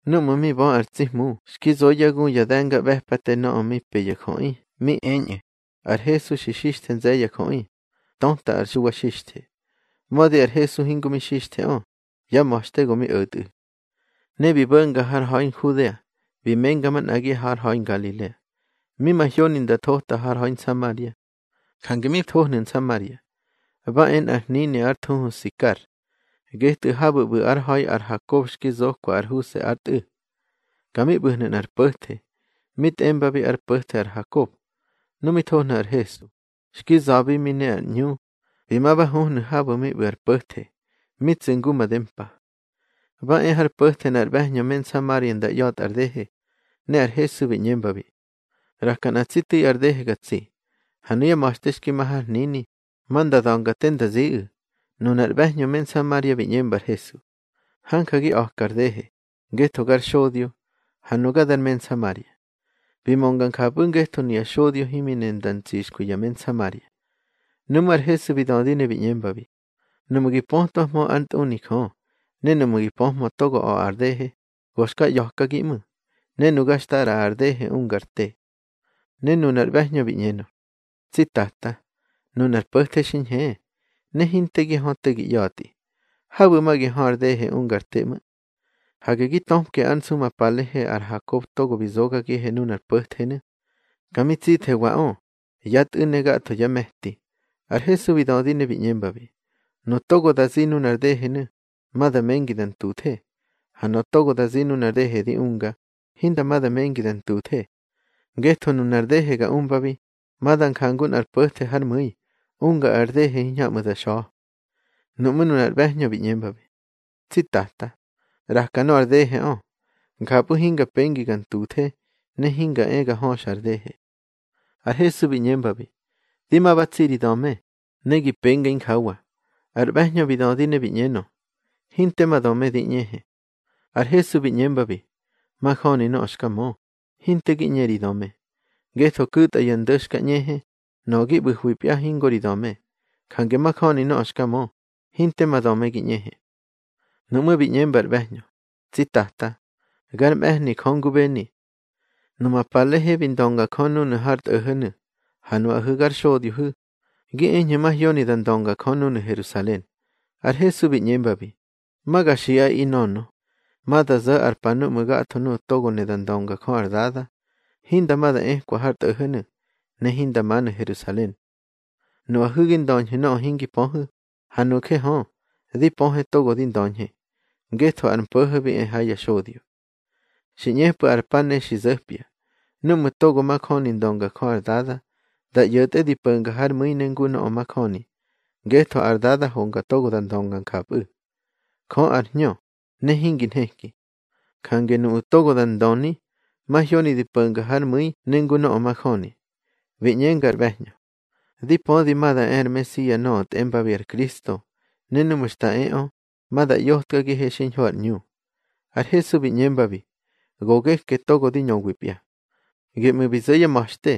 Núꞌmu̱ mi bö ar tsi Hmu xki zo yá gu ya de̱ngaꞌbe̱pate nöꞌö mi pe ya jöꞌi, mi eñꞌu̱: Ar Hesu xa xixthe nze̱ye̱ ya jöꞌi, töta ar Xuwa Xixthe (mödi ar Hesu hingo mi xixtheꞌö, yá ma̱xte go mi o̱tꞌu̱). Ne bi bo̱nga har ha̱i Nhudea, bi menga manꞌagi har ha̱i Ngalilea. Mi mahyoni nda thota har ha̱i Nsamaria. Jange mi thohnu̱ Nsamaria, ba e ha nꞌar hnini ár thuhu Sikar, getꞌu̱ habu̱ ꞌbu̱ ár ha̱i ar Hakob xki zokwa ar Huse ár tꞌu̱. Ka mi ꞌbu̱hnu̱ nꞌar po̱the, mi tꞌembabi ár po̱the ar Hakob. Nu mi thohnu̱ ar Hesu, xki za̱bi mi ne ar ꞌñu, bi ma ba huhnu̱ habu̱ mi ꞌbu̱ ar po̱the, mi tsu̱ ngu made mpa. Ba e har po̱the nꞌar ꞌbe̱hñö me Nsamaria nda ꞌya̱tꞌa ar dehe, ne ar Hesu bi ꞌñembabi: —ꞌRaka nꞌa tsi tu̱i ar dehe ga tsi. Ha nuyá ma̱xte xki ma har hnini, ma nda da̱nga te nda ziꞌu̱. Nunar ꞌbe̱hñö me Nsamaria bi ꞌñemba ar Hesu: —Hanja gi a̱kar dehe, ngetho gar xodyo, ha nuga dar me Nsamaria. Bi mönga njapꞌu̱ ngetho nuya xodyo himi ne nda ntsixkwi ya me Nsamaria. Nuꞌmú̱ ar Hesu bi dödi ne bi ꞌñembabi: —Nuꞌmu̱ gi pötwahmö ár ntꞌuni Jö, ne nuꞌmu̱ gi pöhmö togo a̱ꞌa ar dehe, go xka ꞌya̱kagi ꞌmu̱, ne nuga xta ꞌraꞌa ar dehe unga ar te. Ne nunar ꞌbe̱hñö bi ꞌñenö: —Tsi Tata, nunar po̱the xi ñhe, ne hinte gi hö te gi ꞌya̱tꞌi. Habu̱ ma gi hö ar dehe unga ar te ꞌmu̱. Hage gi töpke ár nsu ma palehe ar Hakob togo bi zogagihe nunar po̱thenu̱. Ka mi tsithewaꞌö, yá tꞌu̱ ne gatho yá me̱ti. Ar Hesu bi dödi ne bi ꞌñembabi: —Nuꞌu̱ togo da zi nunar dehenu̱, ma da mengi da ntuthe. Ha nöꞌö togo da zi nunar dehe di unga, hinda ma da mengi da ntuthe. Ngetho nunar dehe ga umbabi, ma da njangu nꞌar po̱the hár mu̱i, unga ar dehe hiñhamꞌu̱ da xa̱. Nuꞌmú̱ nunar ꞌbe̱hñö bi ꞌñembabi: —Tsi Tata, ꞌraka nöꞌö ar deheꞌö. Njapꞌu̱ hinga pengi ga ntuthe, ne hinga e ga höxa ar dehe. Ar Hesu bi ꞌñembabi: —Di ma ba tsi ri döme, ne gi penga injawa. Ar ꞌbe̱hñö bi dödi ne bi ꞌñenö: —Hinte ma döme di ꞌñehe. Ar Hesu bi ꞌñembabi: —Majöni nöꞌö xka mö, hinte gi ꞌñe ri döme. Ngetho ku̱tꞌa ya ndo̱ xka ꞌñehe, nöꞌö gi ꞌbu̱hwipya hingo ri döme. Jange majöni nöꞌö xka mö, hinte ma döme gi ꞌñehe. Nuꞌmú̱ bi ꞌñemba ar ꞌbe̱hñö: —Tsi Tata, gar mꞌe̱hni Jö ngubeni. Numa palehe bi ndönga Jö núnu̱ har tꞌo̱ho̱nu̱. Ha nuꞌahu̱ gar xodyohu̱, gi eñhu̱ mahyoni da ndönga Jö núnu̱ Herusalen. Ar Hesu bi ꞌñembabi: —Ma ga xiꞌaꞌi, nönö, ma da zo̱ ar pa núꞌmu̱ gatho nuꞌu̱ togo ne da ndönga Jö ar Dada, hinda ma da ekwa har tꞌo̱ho̱nu̱, ne hinda manu̱ Nherusalen. Nuꞌahu̱ gi ndöñhu̱ nöꞌö hingi pöhu̱, ha nuje hö, di pöhe togo di ndöñhe, ngetho ar mpo̱ho̱ bi e ha ya xodyo. Xi ꞌñepꞌu̱ ar pa ne xi zo̱pya, núꞌmu̱ togo majöni ndönga Jö ar Dada, da ꞌyo̱tꞌe di po̱nga hár mu̱i ne ngu nöꞌö majöni, ngetho ar Dada honga togo da ndönga njapꞌu̱. Jö ar hñö, ne hingi nheki. Jange nuꞌu̱ togo da ndöni, mahyoni di po̱nga hár mu̱i ne ngu nöꞌö majöni. Bi ꞌñenga ar ꞌbe̱hñö: —Di pödi ma da e ar Mesia nöꞌö tꞌembabi ar Kristo, ne núꞌmu̱ xta eꞌö, ma da ꞌyotkagihe xiñho ar ꞌñu. Ar Hesu bi ꞌñembabi: —Go geke togo di ñöwipya. Geꞌmu̱ bi zo̱ yá ma̱xte,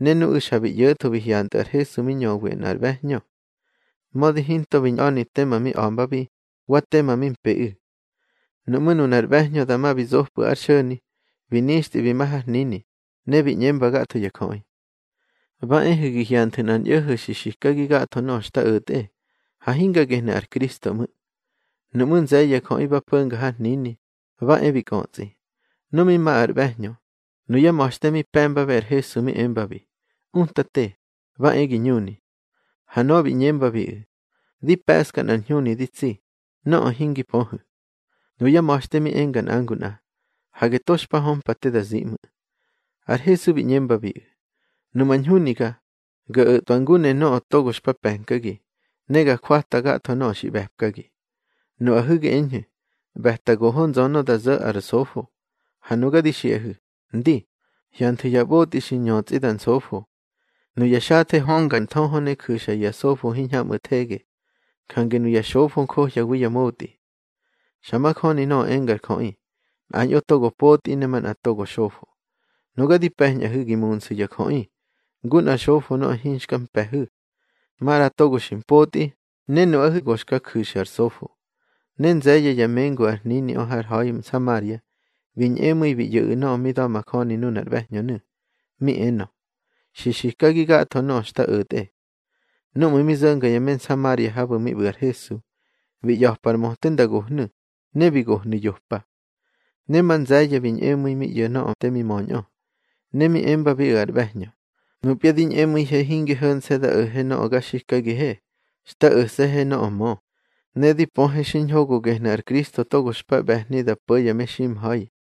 ne nuꞌu̱ xa bi ꞌyo̱tho bi hyantꞌu̱ ar Hesu mi ñöwi nꞌar ꞌbe̱hñö, mödi hinto bi ñꞌa̱ni tema mi a̱mbabi, wa tema mi mpeꞌu̱. Nuꞌmú̱ nunar ꞌbe̱hñö dama bi zopꞌu̱ ár xo̱ni, bi nixtꞌi bi ma har hnini, ne bi ꞌñemba gatho ya jöꞌi: —Ba ehu̱ gi hyanthu̱ nꞌar ñꞌo̱ho̱ xi xikagi gatho nöꞌö xta o̱tꞌe. Ha hinga gehnu̱ ar Kristo ꞌmu̱. Nuꞌmú̱ nze̱ye̱ ya jöꞌi ba po̱nga har hnini, ba e bi kꞌötsꞌi. Nu mi ma ar ꞌbe̱hñö, nuyá ma̱xte mi pe̱mbabiꞌu̱ ar Hesu mi embabi: —Utate, ba e gi ñuni. Ha nöꞌö bi ꞌñembabiꞌu̱: —Di pe̱ꞌska nꞌar ñhuni di tsi, nöꞌö hingi pöhu̱. Nuyá ma̱xte mi enga nꞌa ngu nꞌa: —Hage to xpa hömpa te da zi ꞌmu̱. Ar Hesu bi ꞌñembabiꞌu̱: —Numa ñhuniga, ga o̱tꞌwa ngu ne nöꞌö togo xpa pe̱nkagi, ne ga jwata gatho nöꞌö xi ꞌbe̱pkagi. Nuꞌahu̱ gi eñhu̱, ꞌbe̱ta goho nzönö da zo̱ ar sofo. Ha nuga di xiꞌahu̱: Ndi, hyanthu̱ ya ꞌbotꞌi xi ñötsꞌi da nsofo. Nuya xathe hönga ar nthöhö ne ju̱xa ya sofo hiñhamꞌu̱ thege, jange nuya xofo njohyawi ya motꞌi. Xa majöni nöꞌö engar jöꞌi: Nꞌañꞌo togo potꞌi ne manꞌa togo xofo. Nuga di pe̱ñꞌahu̱ gi munsu̱ ya jöꞌi, ngu nꞌar xofo nöꞌö hinxka mpe̱hu̱. Maꞌra togo xi mpotꞌi, ne nuꞌahu̱ go xka johu̱ ar sofo. Ne nze̱ye̱ ya mengu ar hniniꞌö har ha̱i Nsamaria, bi ñꞌemu̱i mi ꞌyo̱ꞌu̱ nöꞌö mi da̱majöni nunar ꞌbe̱hñönu̱, mi enö: Xi xikagi gatho nöꞌö xta o̱tꞌe. Núꞌmu̱ mi zo̱nga ya me Nsamaria habu̱ mi ꞌbu̱ ar Hesu, bi ꞌya̱pa ar möte nda gohnu̱, ne bi gohnu̱ yopa. Ne ma nze̱ye̱ bi ñꞌemu̱i mi ꞌyo̱ nöꞌö te mi möñꞌö. Ne mi embabiꞌu̱ ar ꞌbe̱hñö: —Nupya di ñꞌemu̱ihe hinge ho̱nse̱ da o̱he nöꞌö ga xikagihe. Xta o̱se̱he nöꞌö mö, ne di pöhe xiñho go gehnu̱ ar Kristo togo xpa ꞌbe̱hni da po̱ ya meximha̱i.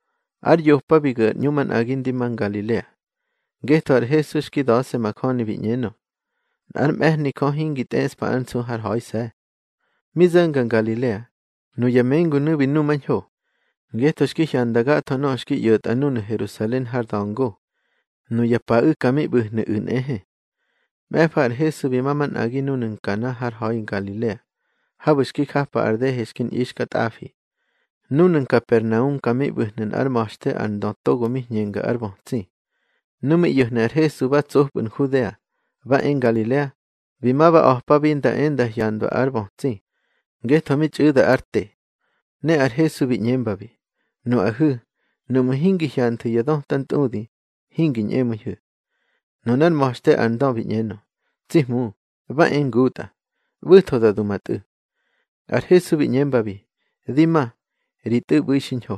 Ár yopa bi gu̱ ar ꞌñu manꞌagi ndi ma Ngalilea. Ngetho ar Hesu xki da̱se̱ majöni bi ꞌñenö, nꞌár mꞌe̱hni Jö hingi tꞌeꞌspa ár nsu hár ha̱ise̱. Mi zo̱nga Ngalilea, nuya mengunu̱ bi numañho, ngetho xki hyanda gatho nöꞌö xki ꞌyo̱tꞌa núnu̱ Herusalen har da̱ngo. Nuya paꞌu̱ ka mi ꞌbu̱hnu̱ꞌu̱ nꞌehe. Mꞌe̱fa ar Hesu bi ma manꞌagi núnu̱ Nkana har ha̱i Ngalilea, habu̱ xki japa ar dehe xki ñꞌixkatꞌafi. Núnu̱ Nkapernaum ka mi ꞌbu̱hnu̱ nꞌár ma̱xte ar ndö togo mi hñenga ár bötsi. Nu mi ꞌyo̱hnu̱ ar Hesu ba tsopꞌu̱ Nhudea, ba e Ngalilea, bi ma ba a̱pabi nda e nda hyandwa ár bötsi, ngetho mi txꞌu̱da ár te. Ne ar Hesu bi ꞌñembabi: —Nuꞌahu̱, nuꞌmu̱ hingi hyanthu̱ ya dötantꞌudi, hingi ñꞌemu̱ihu̱. Nunár ma̱xte ar ndö bi ꞌñenö: —Tsi Hmu, ba e ngutꞌa, ꞌbu̱tho da du ma tꞌu̱. Ar Hesu bi ꞌñembabi: —Di ma, ri tꞌu̱ ꞌbu̱i xiñho.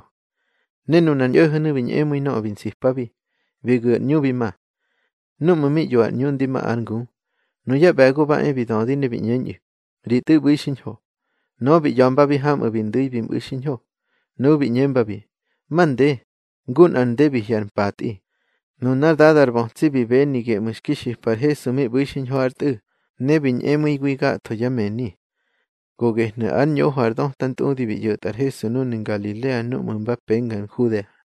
Ne nunar ñꞌo̱ho̱nu̱ bi ñꞌemu̱i nöꞌö bi nsipabi, bi gu̱ ár ꞌñu bi ma. Núꞌmu̱ mi ꞌyo ar ꞌñu ndi ma ár ngu, nuyá ꞌbe̱go ba e bi dödi, ne bi ꞌñeñꞌu̱: —Ri tꞌu̱ ꞌbu̱i xiñho. Nöꞌö bi ꞌya̱mbabi hamꞌu̱ bi ndu̱i bi mꞌu̱ xiñho. Nuꞌu̱ bi ꞌñembabi: —Mande, ngu nꞌar nde bi hye̱ ar mpatꞌi. Nunár dada ar bötsi bi beni geꞌmu̱ xki xipa ar Hesu mi ꞌbu̱ xiñho ár tꞌu̱, ne bi ñꞌemu̱iwi gatho yá mëni. Go gehnu̱ ár ñoho ar döta ntꞌudi bi ꞌyo̱tꞌa ar Hesu núnu̱ Ngalilea núꞌmu̱ mba penga Nhudea.